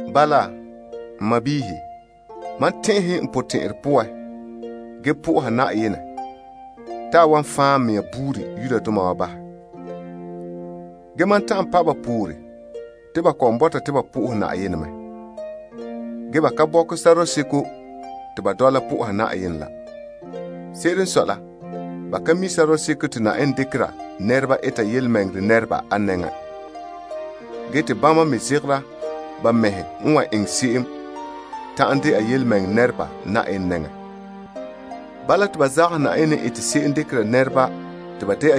Bala, n sɔɔnrɔ, mam tɛn'ɛhe n potɛn'ɛrɛ poan ge sohora Yenɛ te a wan fan' n mɛŋa buuri Israeldoma wa bahɛ. Ge mam ta'an pa' ba poore te ba kɔ'ɔn bɔta te ba soha Yenɛ mɛ. Ge ba ka bɔkɛ sɔrɔɔ seko te ba dɔla soha Yenɛ la. Se'ere n sɔe la, ba ka mi' sɔrɔɔ seko te Yenɛ dekera nɛreba eta tontɔɔ nɛreba a nɛŋan. Ge te bama me zegera ba mɛhe n wan eŋɛ se'em ta'an dɛna tontɔɔ nɛreba Yenɛ nɛŋan. Bala te ba zagahɛ Yenɛ n ete se'em dekera nɛreba te ba dɛna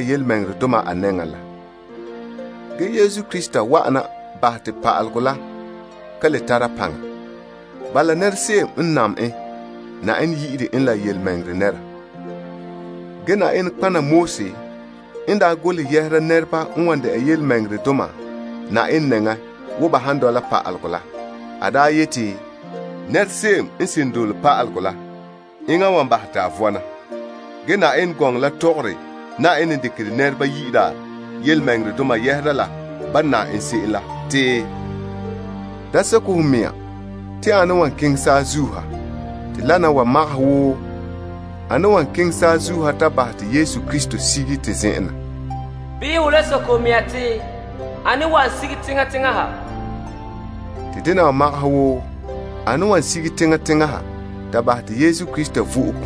tontɔɔ a nɛŋan. Krista wa'ana bahɛ te pa'alegɔ la ka le tara paŋa. Bala, se'em n nam en, Yenɛ yi'ire en la tontɔɔ nɛra. Ge Moses n daa golehɛ yɛhera nɛreba n wan de'a tontɔɔdoma Yenɛ nɛŋa wo ba han dɔla pa'alegɔ la, a daa yeti, Nɛra se'em woo n nane wan vɔna aŋa n bote se'em la. Ge Yenɛ gɔŋɔ la tɔgɔre Yenɛ n dekere nɛreba yi'ira tontɔɔ yɛhera la ban nam en se'em la te, Da soke ho mea te ane n wan zom ha? De vɔnrɛ dela ane n wan tare Yesu Krista sige na. Bii ho le soke ho mea te, Ane wan sige teŋa teŋa ha? De vɔnrɛ dela ane n wan bahɛ te Yesu Krista vo'e.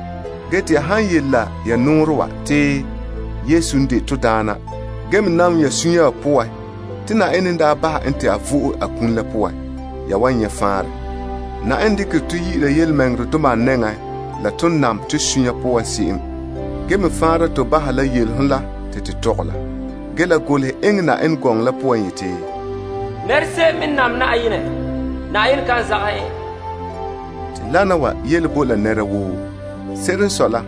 Ge te ya han yele la ya nɔɔrɛ wa te, Yesu n de to Daana ge me nam ya sunya wa poan te Yenɛ n daa bahɛ en te a vo'e a kum la poan, ya wan nyɛ' faanrɛ. Te Yenɛ dekere tɔ yi'ira tontɔɔdoma a nɛŋan la ton nam to sunya poan se'em. Ge me faanra tɔ bahɛ la yele la, te to tɔgɛ la. Ge gɔŋɔ la yeti, Se'em n nam Yenɛ, Yenɛ kan zagahɛ en. Te wana wa yele bo la nɛra woo. Se'ere n sɔe la,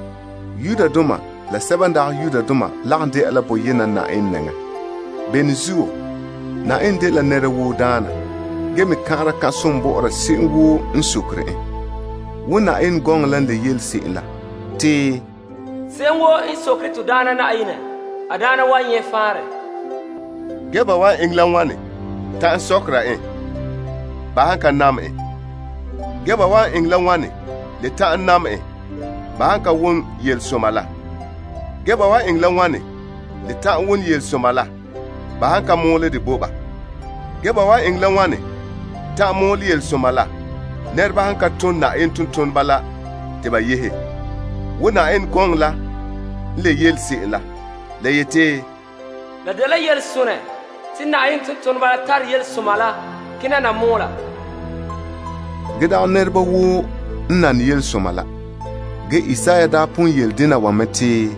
Yudoma la sɛba n dagɛ Yudoma lagom de'a la boyena Na'ayenɛ nɛŋan. Na'ayenɛ dela nɛra woo daana. Ge eta som bɔ'ɔra se'em woo n sokerɛ en. Wo gɔŋɔ la n yele se'em te, Se'em woo n dole Na'ayenɛ yu'urɛ la wan nyɛ faanrɛ. Ge ban wan eŋɛ la wane ta'an sɔkera en, ba han ka nam en? Ge ba wan eŋɛ la wane le ta'an nam en, ba han ka wom yelesoma la? Ge ba wan eŋɛ la wane le ta'an wom yelesoma la ba han ka mɔɔlɛ dɛ bo ba. Ge ban wan eŋɛ la wane ta'an mɔɔlɛ yelesoma la, ba han ka tom tontoneba la te ba yehe? Wo gɔŋɔ la n yele se'em yeti, La dela yelesonɛ te tontoneba tare yelesoma la kena na mɔɔla. Ge dagɛ nɛreba woo n nane yelesoma la. Ge Isaiah daa pon yele dena wa mɛ te,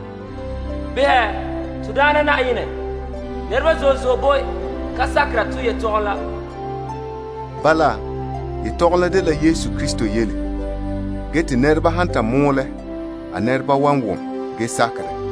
Ane n sakɛ bo to yelehom wa? Bala, yelehom la dela Yesu Krista yele, ge te nɛreba han ta mɔɔlɛ a nɛreba wan wom ge sakɛ dɛ.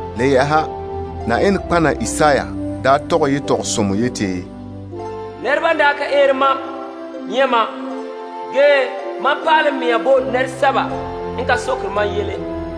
Le yɛ'ɛha, Yenɛ nɔtɔgɔha Isaiah daa tɔgɛ yetɔgɔsomɔ yeti, Nɛreba n daa ka eere mam, nyɛ' mam, ge mam pa'alɛ n mea bo nɛresɛba n ka sokerɛ mam yele.